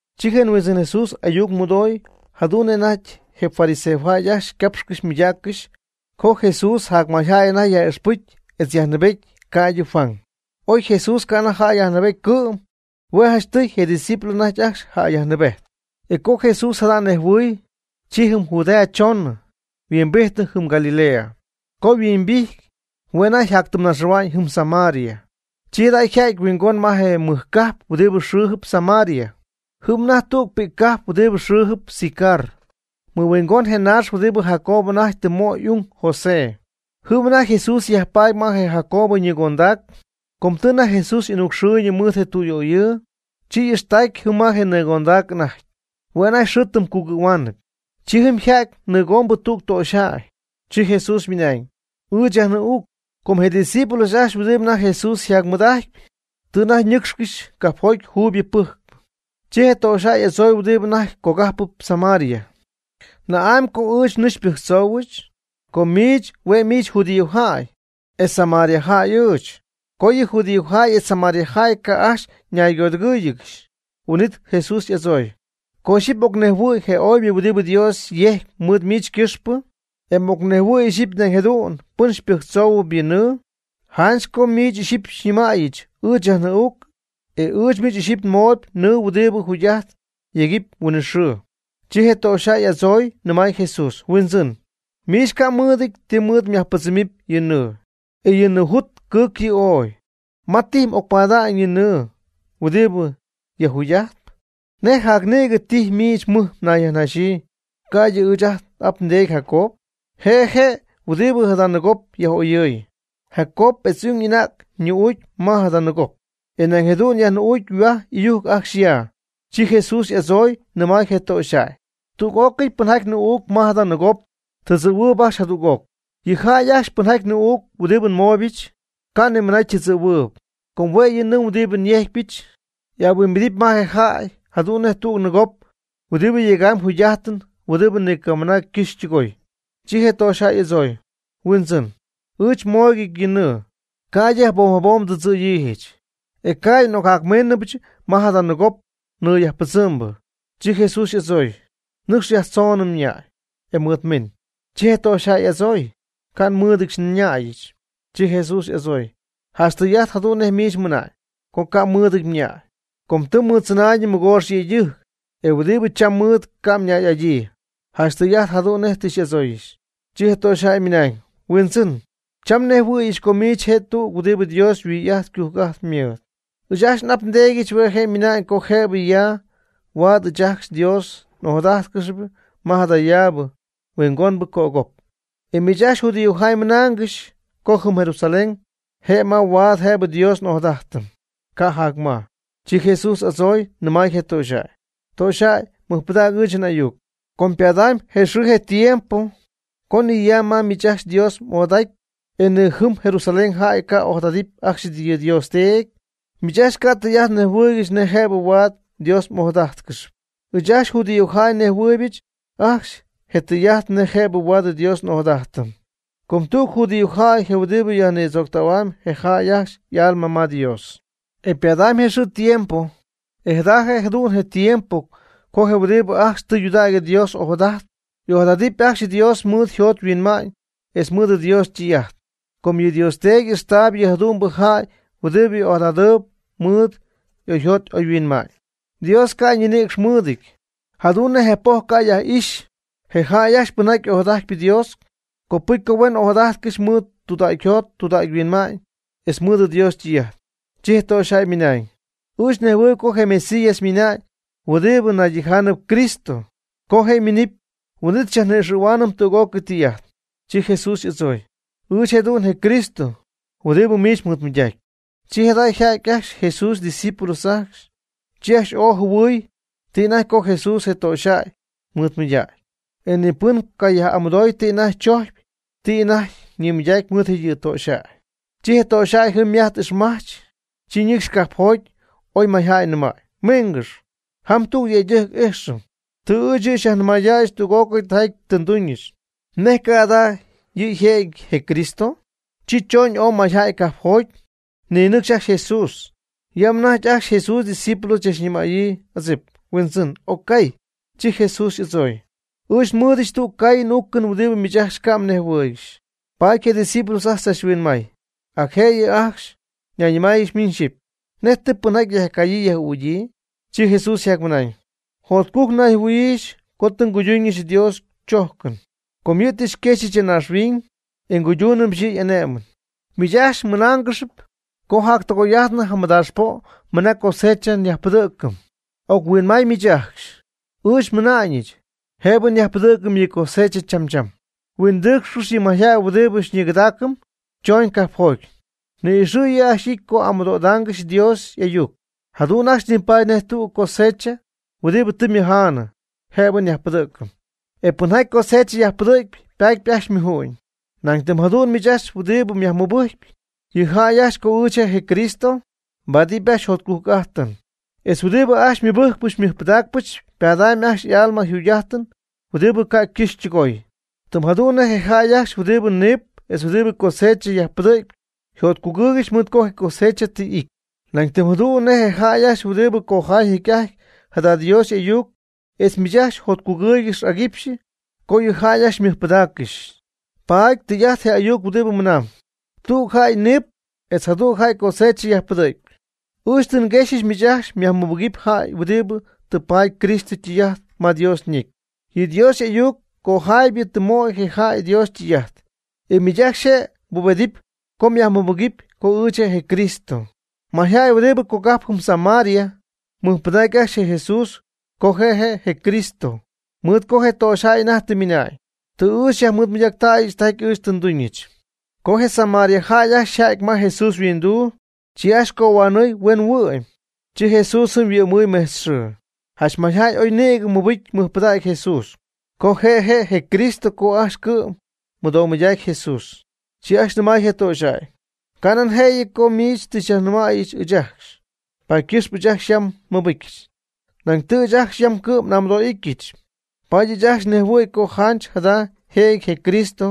Chi je Huindzɨn Jesús ayuc mɨdoy jadu'n nej anajty je fariseojäy ajcxy ycapxcɨxy ymɨydaaccɨxy co je Jesús jacmayjäy anajty yaj'ixpɨcy etz yajnɨɨbety ca'ydɨ Juan. Oy Jesús ca' anajty jäy yajnɨɨbety cɨ'm. Hue' janchtɨy je' ydiscípulos anajty ajcxy jäy yajnɨɨbejtp. E co Jesús jada nejhuɨɨy, chi jɨm Judea chonɨ, yhuimbijtnɨ jɨm Galilea. Co yhuimbijty, hue' anajty yjatytɨmyñaxɨ̈hua'ñ jɨm Samaria. Chi jada' yja'ty huingon ma je mɨj cajp huɨdi xɨɨjɨp Samaria, jɨm ma anajty tüg pi'ccajp huɨdi xɨɨjɨp Sicar, mɨhuingon je naax huɨdibɨ Jacob anajty tɨ möy y'ung José. Jɨm anajty Jesús yajpaady ma je Jacob ñɨɨgondac. Com tɨ anajty Jesús y'anucxɨɨyñɨ mɨɨd je tüyöyɨɨ, chi y'ijxtacy jɨm ma je nɨɨgondac anajty. Hue' anajty xɨɨ jɨm cugɨ̈huaanɨp. Chi jɨm yja'ty nɨɨgombɨ tüg töxyjäy. Chi Jesús ymɨnañ: ―Ɨɨch yajnɨɨ'uucc. Com je' ydiscípulos ajcxy huɨdibɨ anajty Jesús yjaymɨɨd'ajtɨp, tɨ anajty ñɨcxcɨxy cajpjoty juuyb pɨjcp. Chi je töxyjäy y'adzooy huɨdibɨ anajty cogajpɨp Samaria: ―¿Na'amy co ɨɨch nɨɨ xypɨjctzoohuɨch? com miich hue' miich judíojäy, e samariajäy ɨɨch. (Co yɨ judíojäy etz samariajäy ca' ajcxy ñaygodɨgɨ̈yiigɨxy.) Huin'it Jesús y'adzooy: ―Co ixyipy m'ocnejhuɨ̈y je oybɨ huɨdibɨ Dios yejcyp mɨɨd miich ycɨxpɨ, e m'ocnejhuɨ̈y ixyipy nañ jadu'n pɨn xypɨjctzoohuɨpy yɨ nɨɨ, janch co miich ixyipy xyñɨmäyɨch: “Ɨɨch yajnɨɨ'uucc”. E ɨɨch miich ixyipy nmooyb nɨɨ huɨdibɨ jugy'ajt yegɨpy huinɨxɨɨ. Chi je töxyjäy y'adzooy nɨmay Jesús: ―Huindzɨn, miich ca' mmɨɨdɨty ti mɨɨd myajpɨdzɨmɨpy yɨ nɨɨ, e yɨ nɨɨjut cɨɨcy yɨ' ooy. ¿Ma tijy m'ocpada'ñ yɨ nɨɨ huɨdibɨ yajjugy'ajtp? ¿Nej jacnïgɨ tijy miich mɨj mnayyajnaxyii, ca'ydɨ ɨɨch ajt n'ap ndeedy Jacob? Je'je' huɨdibɨ jada nɨɨgop yaj'oyɨɨy. Jacob etz y'ung y'anäg nɨɨ'uuc ma jada nɨɨgop, e nañ jadu'n yajnɨɨ'uucy yhuaj y'ɨyujc ajcxy ya. Chi Jesús y'adzooy nɨmay je töxyjäy: ―Tüg'ócɨy pɨnjaty nɨɨ'uucp ma jada nɨɨgop tɨdzɨ̈ huɨɨb ajcxy jadüg'oc. Yɨ jäy ajcxy pɨnjaty nɨɨ'uucp huɨdibɨ nmooybɨch, ca' ni mɨna ytɨdzɨ̈huɨɨyb, com hue' yɨ nɨɨ huɨdibɨ nyejcypɨch, ahuimbidɨpy ma je jäy jadu'n nej tüg nɨɨgop huɨdibɨ yegam jugy'ajtɨn huɨdibɨ ni ca' ycɨxy ytɨgoy. Chi je töxyjäy y'adzooy: ―Huindzɨn, ɨɨch mooyg yɨ nɨɨ, ca'ydɨ jabom jabom ndɨdzɨ̈yiijɨch, e ca'ydɨ n'ocjacmíinɨbɨch ma jada nɨɨgop nɨɨ yajpɨdzɨmbɨ. Chi Jesús y'adzooy: ―Nɨcx yajtzon mñäy, e mɨɨd miin. Chi je töxyjäy y'adzooy: ―Ca' nmɨɨdɨdyɨch nñäyɨch. Chi Jesús y'adzooy: ―Janch tɨy'ajt jadu'n nej miich mɨna'ñ, co ca' mmɨɨdɨty mñäy. Com tɨ mɨɨddzɨnäy mɨgoox yëydɨjc, e huɨdibɨ cham mmɨɨd, ca' mñäy'adyii. Janch tɨy'ajt jadu'n nej tɨ m'adzooy. Chi je töxyjäy ymɨnañ: ―Huindzɨn, cham nhuinjɨhuɨ̈yɨch co miich je' tüg huɨdibɨ Dios yhuij'ajt ycujc'ajt mɨɨd. Ɨɨch ajcxy n'ap ndeedyɨch hue' je' ymɨnañ co jëbɨ ya huaad ɨɨch ajcxy nDios'ojadájtcɨxyɨch ma jadayaabɨ huingombɨ copjɨjp. E miich ajcxy judíojäy ymɨnaangɨxy co jɨm Jerusalén je' ma huaad jëbɨ nDios'ojadajtɨm, ca' jac ma. Chi Jesús y'adzooy nɨmay je töxyjäy: ―Töxyjäy mɨjpɨdäg ɨɨch n'ayuc. Co ypadamy je xɨɨ je tiempo co ni ya ma miich ajcxy mDios'ojadajttac, e ni jɨm Jerusalén jäy ca' ojadadɨpy ajcxy yɨ Dios Teedy. Miich ajcxy ca' tɨy'ajt mnejhuɨɨygɨxy nej jëbɨ huaad mDios'ojadájtcɨxɨpy. Ɨɨch ajcxy judíojäy nejhuɨɨybɨch ajcxy je tɨy'ajt nej jëbɨ huaad nDios'ojadajtɨm. Com tüg judíojäy je huɨdibɨ yajnïdzooctähuam je jäy ajcxy y'alma ma Dios. Ypadamy je xɨɨ je tiempo, e jada jëdu'n je tiempo co je huɨdibɨ ajcxy tɨydudägy Dios ojadajtp, y'ojadadɨpy ajcxy Dios mɨɨd oyjot oyhuinma'ñ etz mɨɨd Dios ytɨy'ajt. Com yɨ Dios Teedy y'ixtaayb yɨ jadu'mbɨ jäy huɨdibɨ ojadadɨɨb mɨɨd oyjot oyhuinma'ñ. Dios ca' ñinïcx mɨɨdɨty, jadu'n je' nej poj ca' yaj'ixy. Je jäy ajcxy pɨnjaty ojadajtp Dios, copɨcy co huen ojadajtcɨxy mɨɨd tudägyjot tudägyhuinma'ñ, etz mɨɨd Dios ytɨy'ajt. Chi je töxyjäy ymɨnañ: ―Ɨɨch nejhuɨɨyb co je Mesías ymina'ñ huɨdibɨ naydijaanɨp Cristo, co je' yminɨpy, huin'it xyajni'ixɨ̈huaanɨm tüg'ócɨy tɨy'ajt. Chi Jesús y'adzooy: ―Ɨɨch jëdu'n je Cristo huɨdibɨ miich mɨɨdmɨydacyp. Chi jada' yja'ty ajcxy Jesús ydiscípulos ajcxy. Chi ajcxy ooy jɨhuɨy ti anajty co Jesús je töxyjäy mɨɨdmɨydägy, e ni pɨn ca' yaj'amɨdooy ti anajty chojcyp ti anajty yñimɨydacyp mɨɨd yɨ töxyjäy. Chi je töxyjäy jɨm ymajt ixmajch, chi ñɨcxy cajpjoty oy mayjäy nɨmay: ―Mingɨx, jam tüg yëydɨjc ijxɨm. Tɨ ɨɨch yɨ' xyajnɨmaydäyɨch tüg'ócɨy tijaty tɨ nduñɨch. ¿Nej ca' jada' yɨ' jëjɨty je Cristo? Chi choñ ooy mayjäy cajpjoty, ninɨcxy ajcxy Jesús. Yam anajty ajcxy Jesús ydiscípulos chachnɨmäyii adzip: ―Huindzɨn, occaay. Chi Jesús y'adzooy: ―Ɨɨch nmɨɨdɨch tüg caayɨn uucɨn huɨdibɨ miich ajcxy ca' mnejhuɨɨygɨxy. Paady je' ydiscípulos ajcxy tzachhuinmay, ac jëyɨ ajcxy, nayñɨmayɨgɨxy miñ xɨpy: ―¿Nej tɨ pɨnjaty yajcayyii yaj'ügyii? Chi Jesús ymɨnañ: ―Jotcujc nayjɨhuɨ̈yiijɨch co tɨ nguydunɨch Dios chojcɨn. Com yɨ' tɨ xyquexyɨch ya naaxhuiñ, e nguydúunɨbɨch yɨ' y'ané'mɨn. Miich ajcxy mɨnaangɨxp co jactɨgoy'ijtnɨ jamɨdaax po' mɨna cosecha nyajpɨdɨ̈cɨm. Oc-huinmay miich ajcxy, ɨɨch nmɨna'ñɨch, jëbɨ nyajpɨdɨ̈cɨm yɨ cosecha cham cham. Huindɨɨcxcɨx yɨ mayjäy huɨdibɨ xyñigɨdaacɨm chooñ cajpjoty. Ni'ixɨ̈ yɨ' ajcxy y'ity co amɨdo'idaangɨxy Dios y'ayuc. Jadu'n ajcxy nipaty nej tügɨ cosecha huɨdibɨ tɨ ymɨjaanɨ, jëbɨ nyajpɨdɨ̈cɨm. E pɨnjaty cosecha yajpɨdɨ̈cp ypaatyp ajcxy ymuju'ñ. Nañ tɨm jadu'n miich ajcxy huɨdibɨ myajmɨbɨjcy yɨ jäy ajcxy co ɨɨch je' je Cristo, mbaadɨpy ajcxy jotcujc'ajtɨn, etz huɨdibɨ ajcxy xymɨbɨjcpɨch xymɨjpɨdaacpɨch ypadamy ajcxy y'alma jugy'ajtɨn huɨdibɨ ca' ycɨxy ytɨgooy. Tɨm jadu'n nej je jäy ajcxy huɨdibɨ niip etz huɨdibɨ cosecha yajpɨdɨ̈cp yjotcugɨɨygɨxy mɨɨd co je cosecha tɨ y'ity, nañ tɨm jadu'n je jäy ajcxy huɨdi cojaay jecy'ajty jada Dios y'ayuc etz miich ajcxy jotcugɨɨygɨxy aguipxy co yɨ jäy ajcxy xymɨjpɨdägyɨch. Paady tɨy'ajt je ayuc huɨdibɨ mɨnam: “Tüg jäy niip etz jadüg jäy cosecha yajpɨdɨ̈cp.” Ɨɨch tɨ nguexyɨch miich ajcxy myajmɨbɨgɨpy jäy huɨdibɨ tɨ paady Cristo ytɨy'ajt ma Dios ñecy. Yɨ Dios y'ayuc ycojaaybɨ tɨ möy je jäy Dios ytɨy'ajt, e miich ajcxy je' mbubedɨpy co myajmɨbɨgɨpy co ɨɨch je' je Cristo. Mayjäy huɨdibɨ cogajpɨp jɨm Samaria ymɨjpɨdac ajcxy je Jesús co je' je' je Cristo, mɨɨd co je töxyjäy anajty tɨ ymɨna'ñ: “Tɨ yɨ' xyajnɨmaydäyɨch tijaty ɨɨch tɨ nduñɨch.” Co je samariajäy ajcxy yjädy ma Jesús yhuinduu, chi ajcxy cohuanɨɨy huen huɨ'my. Chi Jesús jɨm yhuɨ'mɨɨy mejtz xɨɨ. Janch mayjäy ooy nïgɨ mɨbɨjcy mɨjpɨdacy Jesús, co je' je' je Cristo co ajcxy cɨ'm mɨdomɨydacy je Jesús. Chi ajcxy nɨmay je töxyjäy: ―Canan jëyɨ co miich tɨ xyajnɨmäy ɨɨch ajcxy, paady ycɨxpɨ ɨɨch ajcxy yam nmɨbɨcyɨch. Nañ tɨ ɨɨch ajcxy yam cɨ'm n'amɨdo'ityɨch, paady ɨɨch ajcxy nejhuɨ̈y co janch jada yjëjɨty je Cristo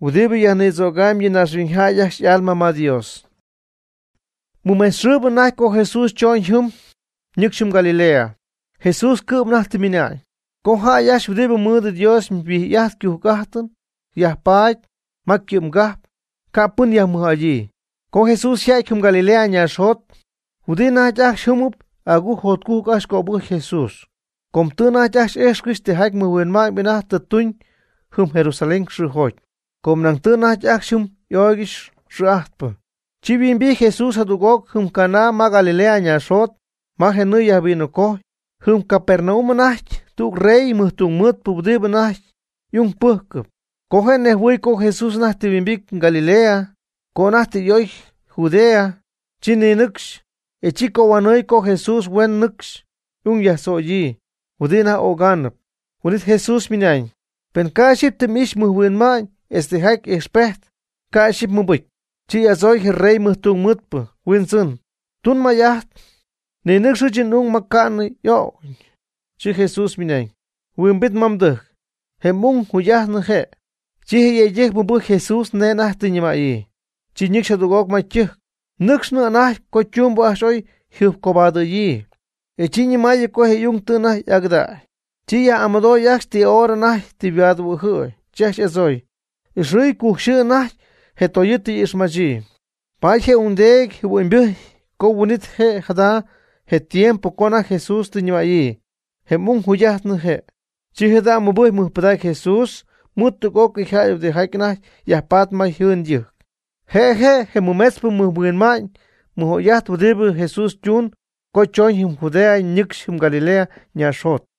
huɨdibɨ yajnïdzögam yɨ naaxhuiñyjäy ajcxy y'alma ma Dios. Mɨmejtz xɨɨbɨ anajty co Jesús chooñ jɨm, nɨcxy jɨm Galilea. Jesús cɨ'm anajty tɨ ymɨna'ñ: ―Co jäy ajcxy huɨdibɨ mɨɨd Dios yhuij'ajt ycujc'ajt yajpaady ma ycɨ'mgajp, ca' pɨn yajmɨj'adyii. Co Jesús yja'ty jɨm Galilea naaxjot, huɨdi anajty ajcxy jɨmɨp agujc jotcujc ajcxy cöbɨjcy Jesús, com tɨ anajty ajcxy ijxcɨxy tijaty mɨjhuinma'ñ anajty tɨ tuñ jɨm Jerusalén xɨɨjoty, com nañ tɨ je' anajty ajcxy jɨm y'oygɨxy xɨɨ'ajtpɨ. Chi yhuimbijty Jesús jadüg'oc jɨm Caná ma Galilea ñaaxjot, ma je nɨɨ yajvinocojy. Jɨm Capernaum anajty tüg rey mɨjtungmɨɨdpɨ huɨdibɨ anajty y'ung pɨ́jcɨp. Co je' nejhuɨy co Jesús anajty tɨ yhuimbity Galilea co anajty tɨ y 'oy Judea, chi ninɨcxy, e chi cohuanɨɨy co Jesús huen nɨcxy y'ung tzoyɨ̈yii huɨdibɨ anajty ögaanɨp. Huin'it Jesús ymɨnañ: ―Pen ca' ixyipy tɨ m'ixy mɨjhuinma'ñ etz tijaty ijxpejt, ca' ixyipy mmɨbɨcy. Chi y'adzoy je rey ymɨjtungmɨɨdpɨ: ―Huindzɨn, tun may'ajt ninɨcx ɨɨch n'ung ma ca'nɨ y'o'cyñɨ. Chi Jesús ymɨnañ: ―Huimbit ma mdɨjc, je m'ung jugy'ajtnɨ je'. Chi je yëydɨjc mɨbɨjcy Jesús nej anajty tɨ ñɨmäyii, chi ñɨcxy jadüg'oc ma ytɨjc. Nɨcxnɨp anajty co ytumbɨ ajcxy oy yjɨjpcobadɨ̈yii, e chi ñɨmaayɨ co je' y'ung tɨ anajty y'agɨdägy. Chi yaj'amɨdooy ajcxy ti hora anajty tɨ yhuaadjɨhuɨ̈y, chi ajcxy y'adzooy: ―Ɨxɨɨy cujc yxɨɨ naxy je toyɨɨ y'ixmajtznɨ. Paady je ungdeedy jɨhuɨ'ñybɨjcy co huin'it je' jada' je tiempo co anajty Jesús tɨ ñɨmäyii: “Je m'ung jugy'ajtnɨ je'.” Chi jada' mɨbɨjcy mɨjpɨdacy Jesús mɨɨd tüg'ócɨy jäy huɨdijaty anajty yajpat ma yjɨɨn ytɨjc. Je' je' je mɨmetzpɨ mɨjhuinma'ñ mɨj'oy'ajt huɨdibɨ Jesús ytun co chooñ jɨm Judea ñɨcxy jɨm Galilea ñaaxjot.